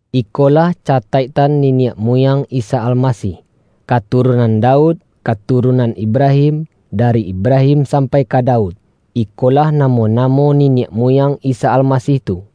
Ikolah cataiktan niniak muyang Isa Almasih, katurunan Daud, ka-turunan Ibrahim. Dari Ibrahim sampai ka Daud, ikolah namo-namo niniak mu-yang Isa Almasih tu: